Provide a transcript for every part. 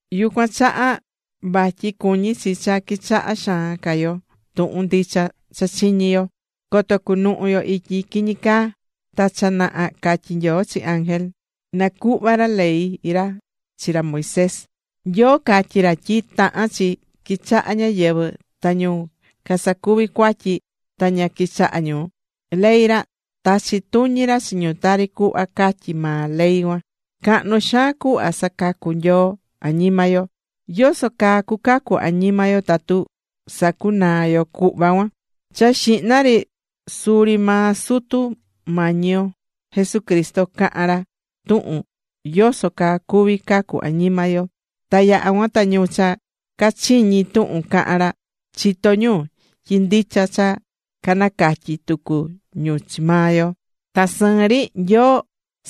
Yucuan chaha vatyi cuñí chi cha quichahá xaan ca yo tuhun ndicha cha chiñi̱ yo, coto cunuhu yo ityi quiñi caa. Ta cha naha catyi̱ Nyoo chi ángel, na cuhva ra ley ra chi ra Moisés. Nyoo catyi̱ ra tyi tahán chi quichaha ñáyɨvɨ. Ta ñu casacuvi̱ cuatyi ta ña quichaha̱ ñu ley ra, tachi̱ tuñi ra chi ñu tari cuhva catyí maa ley cuan. Cahnu xaan cuhva sacacú Nyoo añima yo. ¿Yoso caa cucacu añima yo tatu sacunaa yo cuhva cuan? Cha xihna ri suri maa Sutu Mañi yo Jesucristo caha̱n ra tuhun yoso caa cuví cacu añima yo. Ta yaha̱ cuan ta ñu cha cachiñi̱ tuhun caha̱n ra, chitó ñu tyi ndicha ta canacatyi̱ tucu ñu chi maa yo. Ta sɨɨn ri, Nyoo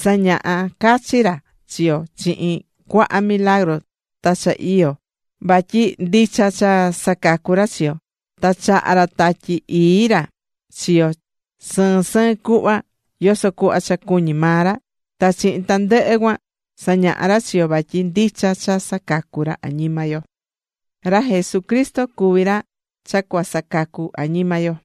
sañaha̱ cachi ra chi yo chihin cuaha milagru ta cha iyo, vatyi ndicha cha sacacú ra chi yo. Ta chaha̱ ra Tatyi Ii ra chi yo sɨɨn sɨɨn cuhva, yoso cuhva cha cuñí maa ra. Ta chihin tandɨhɨ cuan sañaha ra chi yo vatyi ndicha cha sacacu ra añima yo.Ra Jesucristo cuví ra cha cua sacacu añima yo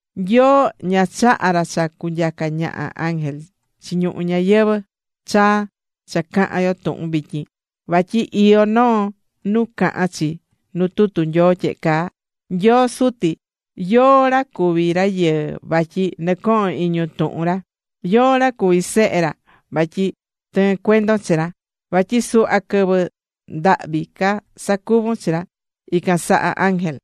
Nyoo, ña chaha̱ ra cha cunyaca ñaha ángel chi ñuhu ñayɨvɨ̱ chaa cha cahán yo tuhun vityin. Vatyi iyó noo nuu cahán chi nu tutu Nyoo tyehe caa: Nyoo Suti ¿yóó ra cuví rayɨɨ vatyi nɨcohon iñun tuhun ra? ¿Yóó ra cuví Sehe ra vatyi tɨɨ́n cuendon chi ra? Vatyi suhva quɨvɨ, ndahvi ca sacuvu̱n chi ra, ican saha ángel.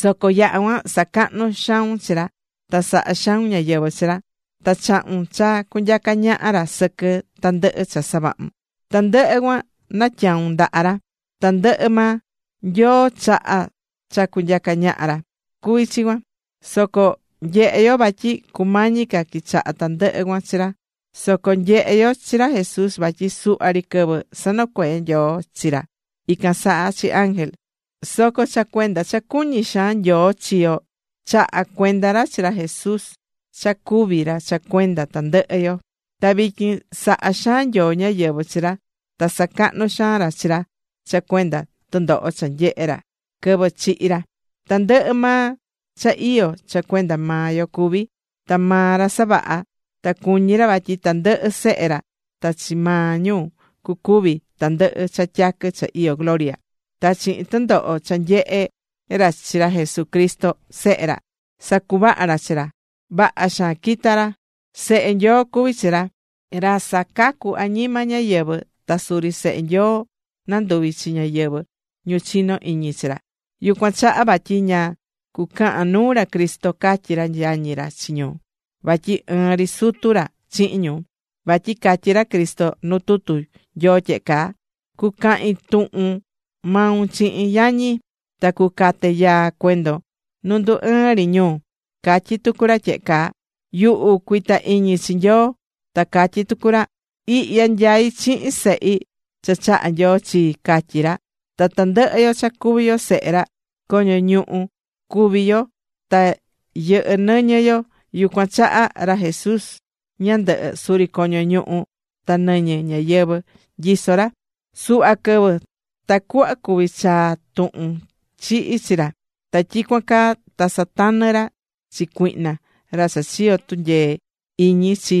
Soco yaha̱ cuan sacahnu̱ xaun chi ra. Ta sahá xaun ñáyɨvɨ chi ra. Ta chahu̱n cha cunyaca ñaha ra sɨquɨ tandɨhɨ cha savahu̱n. Tandɨhɨ cuan natyaun ndaha ra. Tandɨhɨ maa, Nyoo chaha̱ cha cunyaca ñaha ra, cuví chi cuan. Soco nyehé yo vatyi cumañi ca quichaha tandɨhɨ cuan chi ra. Soco nyehé yo chi ra Jesús vatyi suhva ri quɨvɨ, sanocuee̱ Nyoo chi ra ican saha chi ángel. Soco cha cuenda cha cuñí xaan Nyoo chi yo, chaha̱ cuenda ra chi ra Jesús cha cúvi ra cha cuenda tandɨhɨ yo. Ta vityin sahá xaan Nyoo ñáyɨvɨ chi ra ta sacahnú xaan ra chi ra cha cuenda tɨndoho cha nyehe̱ ra quɨvɨ chihi̱ ra. Tandɨhɨ maa cha iyó, cha cuenda maa Nyoo cuví. Ta maa ra savaha̱. Ta cuñí ra vatyi tandɨhɨ sehe ra ta chi maa ñu cucuvi tandɨhɨ cha tyaquɨ cha iyó gloria. Ta chihin tɨndoho cha sanyehe̱ ra chi ra Jesucristo Sehe ra, sacuvaha̱ ra chi ra. Vaha xaan quita̱ ra. Sehe Nyoo cuví chi ra Cristo, ra sacacú añima ñáyɨvɨ. Ta suri sehe Nyoo nanduví chi ñáyɨvɨ ñu chinó iñi chi ra. Yucuan chaha vatyi ña cucahan nuu ra Cristo catyí ra yañi ra chi ñu, vatyi ɨɨn ri sutu ra chihin ñu. Vatyi catyí ra Cristo nu tutu Nyoo tyehe caa: Cucahin tuhun maun chihin yañi. Ta cucate yaa cuendon nu ndú ɨɨn ri ñu. Catyí tucu ra tyehe caa: Yuhu cuita iñi chi Nyoo. Ta catyí tucu ra: Ihya nyaí chihin sehi, cha chaha̱ Nyoo chi, catyí ra. Ta tandɨhɨ yo cha cuví yo sehe ra, coño ñuhu cuví yo ta yɨhɨ́ nɨñɨ yo, yucuan chaha ra Jesús ñandɨhɨ, suri coño ñuhu ta nɨñɨ ñáyɨvɨ nyiso̱ ra suhva quɨvɨ, tacuhva cuví chaa tuhun chihi chi ra, ta tyicuan caa ta satanɨ̱ ra chi cuihna, ra cha chiyo̱ tunyee iñi chi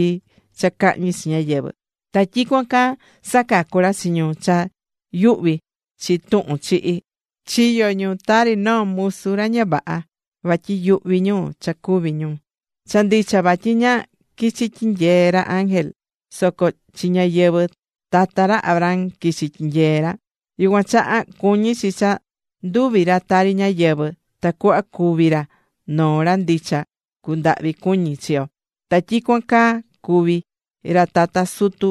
cha cahñi chi ñáyɨvɨ. Ta tyicuan caa sacacu̱ ra chi ñu cha yuhvi̱ chi tuhun chihi. Chiyo̱ ñu tari noo musu ra ña vaha vatyi yuhvi̱ ñu cha cúvi ñu. Cha ndicha vatyi ña quichi̱ tyinyee ra chi ángel, soco chi ñáyɨvɨ tata ra Abraham quichi̱ tyinyee̱ ra. Yucuan chaha cuñi̱ chi cha nduvi̱ ra tari ñáyɨvɨ, tacuhva cuvi ra noo ra ndicha cundahvi cuñi chi yo. Ta tyicuan caa cuví ra tata sutu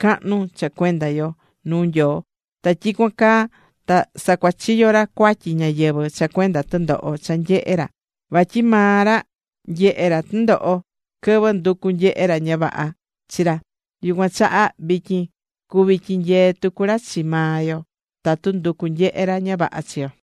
cahnu cha cuenda yo nuu Nyoo. Ta tyicuan caa ta sacuachiyo̱ ra cuatyi ñáyɨvɨ cha cuenda tɨndoho cha nyehe̱ ra. Vatyi maa maa ra nyehe̱ tɨndoho quɨvɨ nducu̱ nyehe ra ña vaha chi ra, yucuan chaha, vityin cuví tyinyee tucu ra chi maa yo tatu nducú nyehe ra ña vaha chi yo.